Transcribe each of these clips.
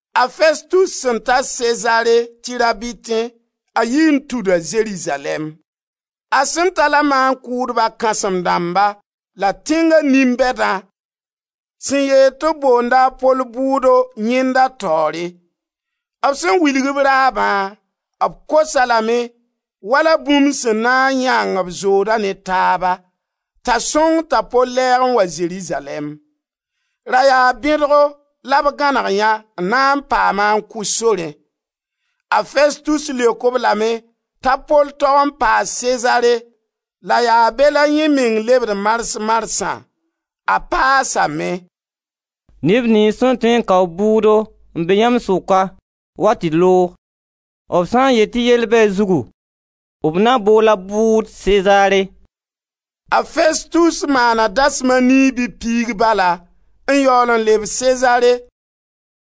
A Festus sẽn ta Sezare tɩ rabitẽ, a yii n tuda Zerizalɛɛm. A sẽn ta la maan-kʋʋdba kãsem-dãmba la tẽnga nin-bɛdã sẽn yeel tɩ b boonda a Pol bʋʋdo yẽnda taoore. B sẽn wilg b raabã, b kos-a lame wala bũmb sẽn na n yãng b zooda ne taaba, t'a sõng t'a Pol lɛɛg n wa Zerizalɛɛm. Ra yaa bẽdgo la b gãneg yã n na n paam-a n kʋ sorẽ. A Festus leok-b lame t'a Pol tog n paa Sezare la yaa be la yẽ meng lebd mars-marsã. A paasame: «Neb niyns sẽn tõe n kao bʋʋdo n be yãmb sʋka, wa tɩ d loog. B sã n yet tɩ yell be a zugu, b na bool-a bʋʋd Sezare.» A Festus maana dasem a nii bɩ piig bala n yaool n leb Sezare.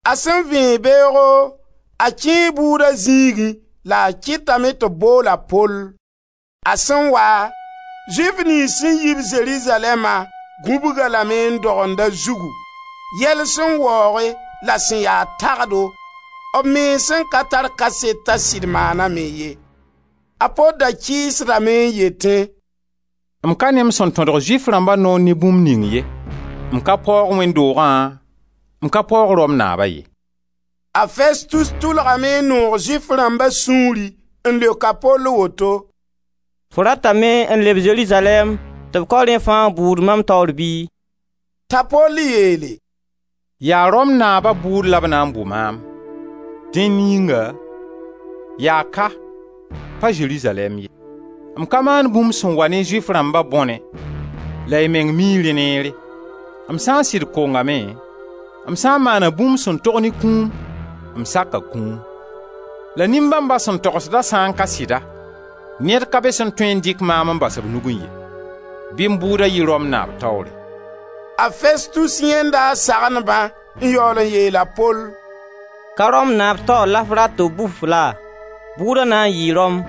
A sẽn vẽeg beoogo, a kẽe bʋʋda zĩigẽ la a kɩtame tɩ b bool a Pol. A sẽn wa, Zʋɩf niyns sẽn yi-b Zerizalɛɛma gũbg-a lame n dogend a zugu, yɛl sẽn waooge la sẽn ya tagdo, b mens sẽn ka tar kaset t'a sɩd maaname ye. A Pol da kɩɩsdame n yetẽ: «M ka ne m sẽn tõdg Zʋɩf rãmba noor ne bũmb ning ye, m ka paoog wẽnd doogã, m ka paoog Rom naaba ye.» A Festus tʋlgame n noog Zʋɩf rãmba sũuri n leok a Pol woto: «Fo ratame n leb Zerizalɛɛm tɩ b kao rẽ fãa bʋʋd mam taoor bɩ?» T'a Pol yeele: «Yaa Rom naaba bʋʋd la b na n bʋ maam; dẽn yĩnga yaa ka, pa Zerizalɛɛm ye. M ka maan bũmb sẽn wa ne Zʋɩf rãmba bõne, la y meng mii rẽ neere. M sã n sɩd kongame, m sã n maana bũmb sẽn tog ne kũum, m saka kũum. La nin-bãmba sẽn togsda sã n ka sɩda, ned ka be sẽn tõe n dɩk maam n bas b nugẽ ye. Bɩ m bʋʋda yɩ Rom naab taoore!» A Festus yãenda a sagendbã n yaool n yeel a Pol: «Ka Rom naab taoor la f rat tɩ b bʋ-f laa? Bʋʋda na yɩ Rom.»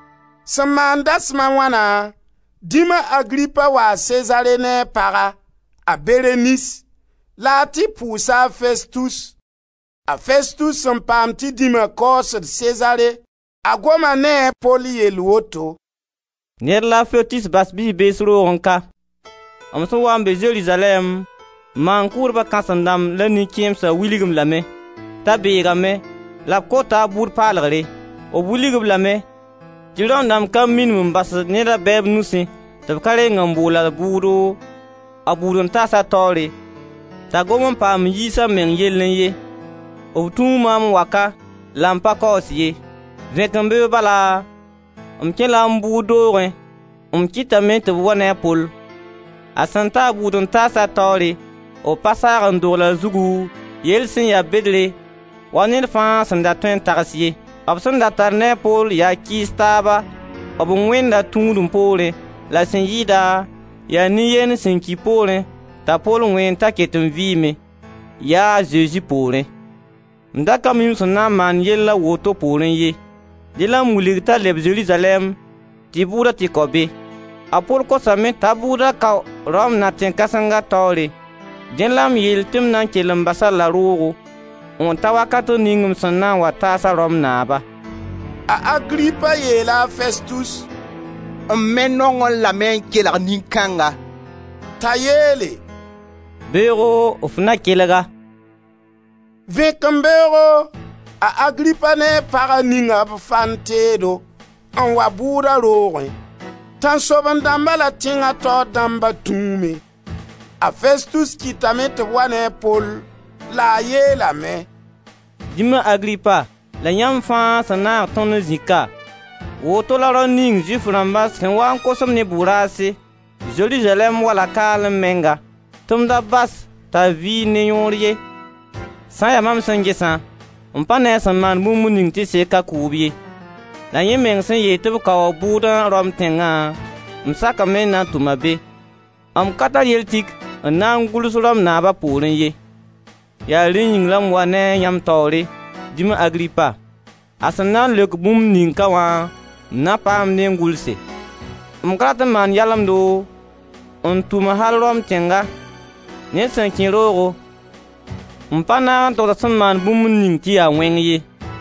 Sẽn maan dasem a wãna, dĩma Agripa waa Sezare ne a paga, a Berenis, la a tɩ pʋʋsa a Festus. A Festus sẽn paam tɩ dĩma kaoosd Sezare, a goma ne-a, a Pol yell woto: «Ned la a Festus bas bi-bees roogẽ ka. M sẽn waa n be Zerizalɛɛm, maan-kʋʋdba kãsem-dãmb la nin-kẽemsã wilg-m lame t'a beegame la b kota a bʋʋd paalgre. M wilg-b lame tɩ Rom dãmb ka minim n basd ned a bɛɛb nusẽ tɩ b ka reng n bool-a bʋʋdo, a bʋʋd-n-taasa taoore t'a gom n paam n yiis a meng yellẽ ye. B tũu maam n wa ka, la m pa kaoos ye, vẽkẽmbeoog bala, m kẽ-la m bʋʋd doogẽ la m kɩtame ti b wa ne a Pol. A sẽn ta a bʋʋd-n-taasa taoore, b pa saag n dogl a zugu, yell sẽn ya bedre wa ned fãa sẽn da tõe n tags ye. B sẽn da tar ne a Pol yaa kɩɩs taaba b Wẽnda tũudem poorẽ, la sẽn yɩɩda, yaa nin-yend sẽn ki poorẽ t'a Pol wẽend t'a ket n vɩɩme, ya a Zezi poorẽ, M da ka mi m sẽn na n maan yell a woto poorẽ ye. Dẽ la m wilg-a t'a leb Zerizalɛɛm tɩ bʋʋda tɩ kao be. A Pol kosame t'a bʋʋda kao Rom na kãsenga taoore, dẽ la m yeel tɩ m na n kell n bas-a la roogo n ta wakat ning m sẽn na n taas-a Rom naaba.» A Agripa yeela a Festus: «M me nongẽ lame n kelg nin-kãnga.» T'a yeele: «Beoogo f na kelg-a.» Vẽkembeoogo a Agripa ne a paga ninga b fan teedo n wa bʋʋda roogẽ. Tãnsoaben-dãmba la tẽnga taoor dãmba tũume. A Festus kɩtame tɩ b wa ne a Pol, la a yeelame: «Dĩma Agripa la yãmb fãa sẽn naag tõnd n zĩ ka, woto la rao ning Zʋɩf rãmba sẽn waa n kos-m ne bʋ-raase, Zerizalɛɛm wala kaalẽ menga, tɩ m da bas-a t'a vɩɩnd ne yõor ye. Sã n ya maam sẽn gesã, m pa ne a sẽn maan bũmb ning tɩ sek a kʋʋb ye. La yẽ meng sẽn yeel tɩ b kao a bʋʋdã Rom tẽnga, m sakame n na n tʋm-a be. M ka tar yell tik n na n gʋls Rom naab a poorẽ ye. Yaa rẽn yĩng la m wa ne a yãmb taoore, dĩma Agripa. A sẽn na n leok bũmb ning ka wã m na paam dẽ n gʋlse. M ka rat n maan yalemdo n tʋm al Rom tẽnga, ned sẽn kẽ roogo, n pa naag n togs a sẽn maan bũmb ning tɩ ya wẽng ye.»